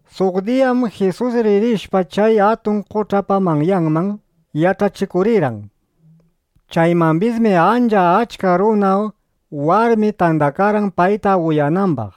Suq diyam Jisus ririshpa chay atun qoch'apa manyanman, yach'achikurirqan. Chaymambismi ancha achka runa, warmi tandakarqan, payta uyanambaq.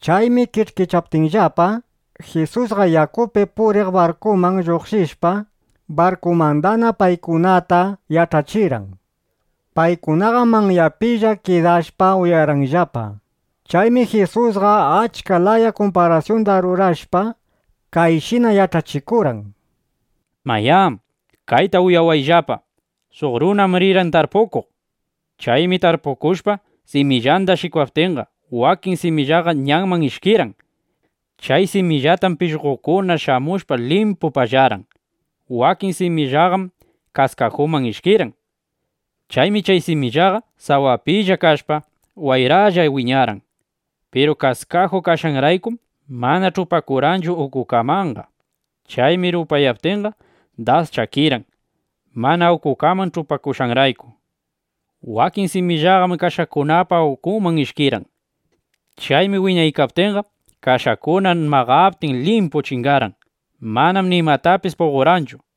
Chaymi kish'kichaptinllapa, Jisusqa yakupi puriq barkuman lluqshishpa, barkumandana paykunata yach'achirqan. Paykunaqam manyapilla kidashpa uyarqanllapa. Chaymi Jisusqa achka laya kumparasyunda rurashpa, kayshina yach'achikurqan: —Mayá, kayta uyawayllapa: Suq runam rirqan tarpukuq. Chaymi tarpukushpa, simillanda shikwaptinqa, wakin simillaqa ñanman ishkirqan. Chay simillitatam pishqokuna shamushpa limpu pallarqan. Wakin simillaqam kaskajuman ishkirqan. Chaymi chay simillaqa sawapilla kashpa, wayralla wiñarqan. Piru kaskaju kashqanraykum, mana ch'upakurqanchu ukukamanqa. Chaymi rupayaptinqa, das chakirqan, mana ukukaman ch'upakushqanrayku. Wakin simillaqam kashakunapa ukunman ishkirqan. Chaymi wiñaykaptinqa, kashakuna maqaptin, limpu chingarqan. Manam nimatapis puqorqanchu.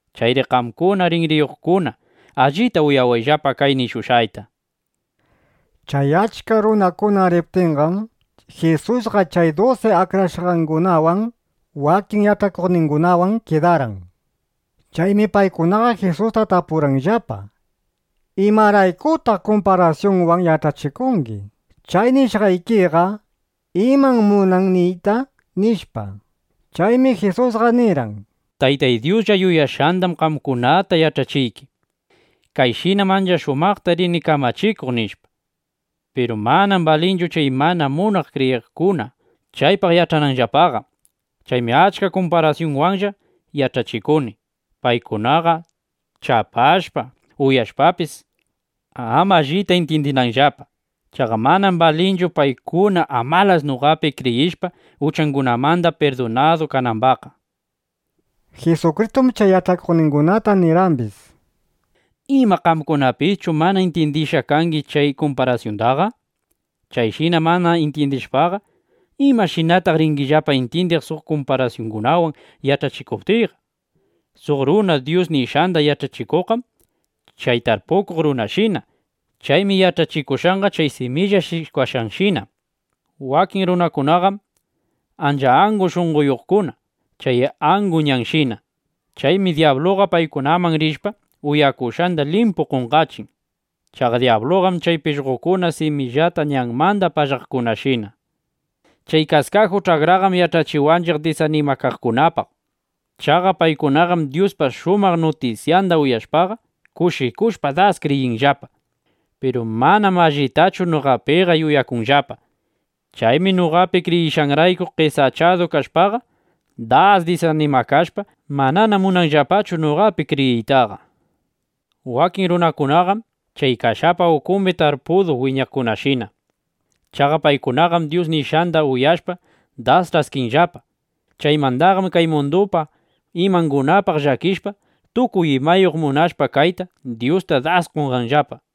¡Chayri qamkuna rinriyuqkuna, allita uyawayllapa kay nishushqayta! Chay achka runakuna riptinqam, Jisusqa chay dusi akrashqangunawan, wakin yach'akuqningunawan kidarqan. Chaymi paykunaqa Jisusta tapurqanllapa: —¿Imaraykutaq kumparasyunwan yach'achikungi? Chay nishqaykiqa ¿imam munan niyta? nishpa. Chaymi Jisusqa nirqan: —Taytay Dyuslla yuyashqandam qamkunataqa yach'achiyki: Kayshinam ancha shumaqta rini kamachikuq, nishpa. Piru manam balinchu chay mana munaq kriyiqkuna chaypaq yach'ananllapaqa. Chaymi achka kumparasyunwanlla yach'achikuni, paykunaqa chapashpa, uyashpapis, ama allita intyindinanllapa. Chaqa manam balinchu, paykuna amalas noqapi kriyishpa, uchangunamanda pirdunadu kanambaqqa, nishpa. Jisukristum chay yach'akuqningunata nirqambis: —¿Ima qamkunapischu mana intyindishqa kangi chay kumparasyundaqa? Chayshina mana intyindishpaqa, ¿imashinataq ringillapa intyindiq suq kumparasyungunawan yach'achikuptiyqa? Suq runa Dyus nishqanda yach'achikuqqam chay tarpukuq runashina. Chaymi yach'achikushqanqa chay similla shikwashqanshina. Wakin runakunaqam ancha angu shunqoyuqkuna chay angu ñanshina. Chaymi dyabluqa paykunaman rishpa, uyakushqanda limpu qonqachin. Chaqa dyabluqam chay pishqokuna simillata ñanmanda pallaqkunashina. Chay kaskaju ch'akraqam yach'achiwanchiq chay das disanimakaqkunapaq. Chaqa paykunaqam Dyuspa shumaq nutisyanda uyashpaqa, kushikushpa das kriyinllapa. Piru manam allitachu noqapiqa yuyakunllapa. Chaymi noqapi kriyishqanrayku qesachadu kashpaqa, das disanimakashpa, manana munanllapachu noqapi kriyiytaqa. Wakin runakunaqam chay kashapa ukumbi tarpudu wiñaqkunashina. Chaqa paykunaqam Dyus nishqanda uyashpa, das ch'askinllapa. Chaymandaqam kay mundupa imangunapaq llakishpa, tukuy imayuq munashpa kayta, Dyusta das qonqanllapa.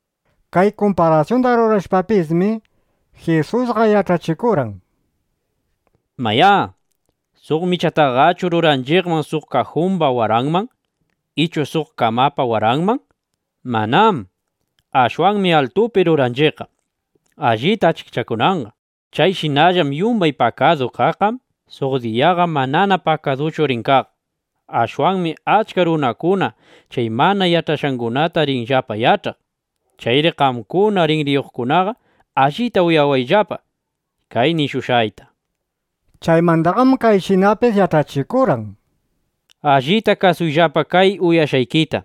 Kay kumparasyunda rurashpapismi, Jisusqa yach'achikurqan: —Mayá, ¿suq michataqachu ruranchiqman suq kajumba waranman ichu suq kamapa waranman? Manám. Ashwanmi altupi ruranchiqqa, allita achikchakunanqa. Chayshinallam yumbay pakadu kaqqam suq diyaqa manana pakaduchu rin kaq. Ashwanmi achka runakuna chay mana yach'ashqangunata rinllapa yach'aq. Chayri qamkuna rinriyuqkunaqa, allita uyawayllapa kay nishushqayta, nishpa. Chaymandaqam kayshinapis yach'achikurqan: —Allita kasuyllapa kay uyakushqaykita.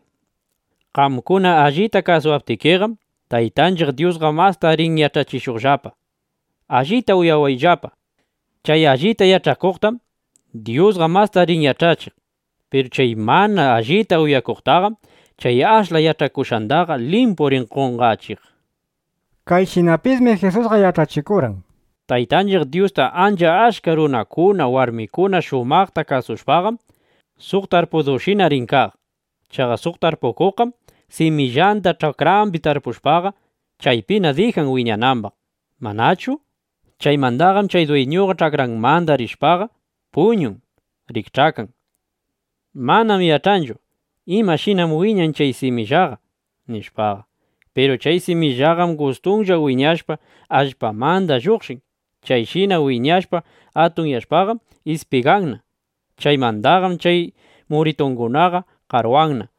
Qamkuna allita kasuwaptikiqam, Taytanchiq Dyusqa masta rin yach'achishuqllapa. Allita uyawayllapa, chay allita yach'akuqtam Dyusqa masta rin yach'achiq. Piru chay mana allita uyakuqtaqam chay ashla yach'akushqandaqa limpu rin qonqachiq. Kayshinapismi Jisusqa yach'achikurqan: —Taytanchiq Dyusta ancha achka runakuna, warmikuna shumaqta kasushpaqam, suq tarpudushina rin kaq. Chaqa suq tarpukuqqam simillanda ch'akrambi tarpushpaqa, chaypina dijan wiñanambaq, ¿manachu? Chaymandaqam chay dwiñuqa ch'akranmanda rishpaqa, puñun, rikch'akan. Manam yach'anchu, imashinam wiñan chay simillaqa, nishpaqa. Piru chay simillaqam gustunlla wiñashpa, allpamanda lluqshin. Chayshina wiñashpa atunyashpaqam ispiganna. Chaymandaqam chay muritungunaqa qarwanna.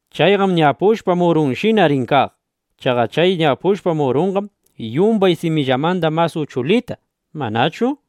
Chayqam ñapushpa murunshina rin kaq. Chaqa chay ñapushpa murunqam yumbay simillamanda mas uchulita, ¿manachu?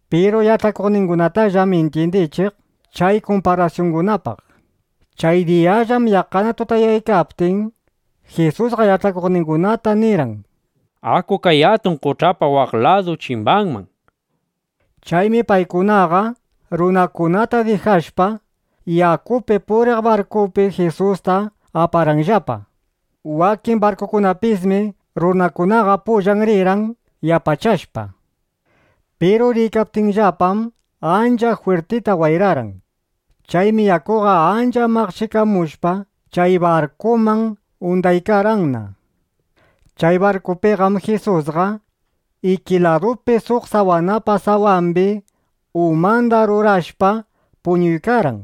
Piru yach'akuqningunatallam intyindichiq chay kumparasyungunapaq. Chay diyallam yaqqana tutayaykaptin, Jisusqa yach'akuqningunata nirqan: —Aku kay atun qoch'apa waq ladu chimbanman, nishpa. Chaymi paykunaqa, runakunata dijashpa, yakupi puriq barkupi Jisusta aparqanllapa. Wakin barkukunapipismi runakunaqa pullan rirqan yapachashpa. Piru riykaptinllapam, ancha jwirtita wayrarqan. Chaymi yakuqa ancha maqchikamushpa chay barkuman undaykarqanna. Chay barkupiqam Jisusqa iki ladupi suq sawanapa sawambi umanda rurashpa puñuykarqan.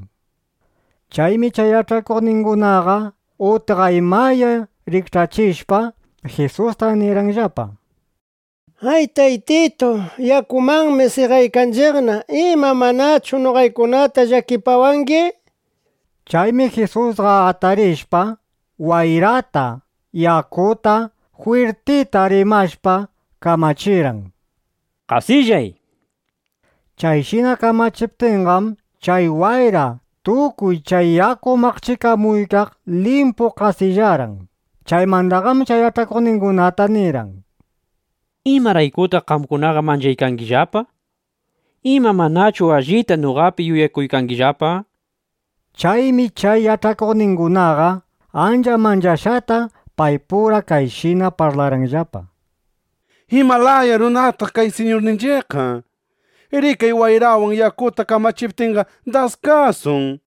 Chaymi chay yach'akuqningunaqa utqaymaya rikch'achishpa, Jisusta nirqanllapa: —¡Ay, Taytitu! ¡Yakumanmi seqaykanchiqna! ¿Ima, manachu noqaykunata llakipawangi? nishpa. Chaymi Jisusqa atarishpa, wayrata, yakuta jwirtita rimashpa kamachirqan: —¡Qasillay! nishpa. Chayshina kamachiptinqam, chay wayra, tukuy chay yaku maqchikamuykaq limpu qasillarqan. Chaymandaqam chay yach'akuqningunata nirqan: —¿Imaraykutaq qamkunaqa mancharqaykillapa? ¿Ima manachu allita noqapi yuyakungillapa? nishpa. Chaymi chay yach'akuqningunaqa ancha manchashqata paypura kayshina parlarqanllapa: —¿Ima laya runataq kay Siñurninchiqqa? ¡Rikay, wayrawan yakuta kamachiptinqa, das kasun! nishpa.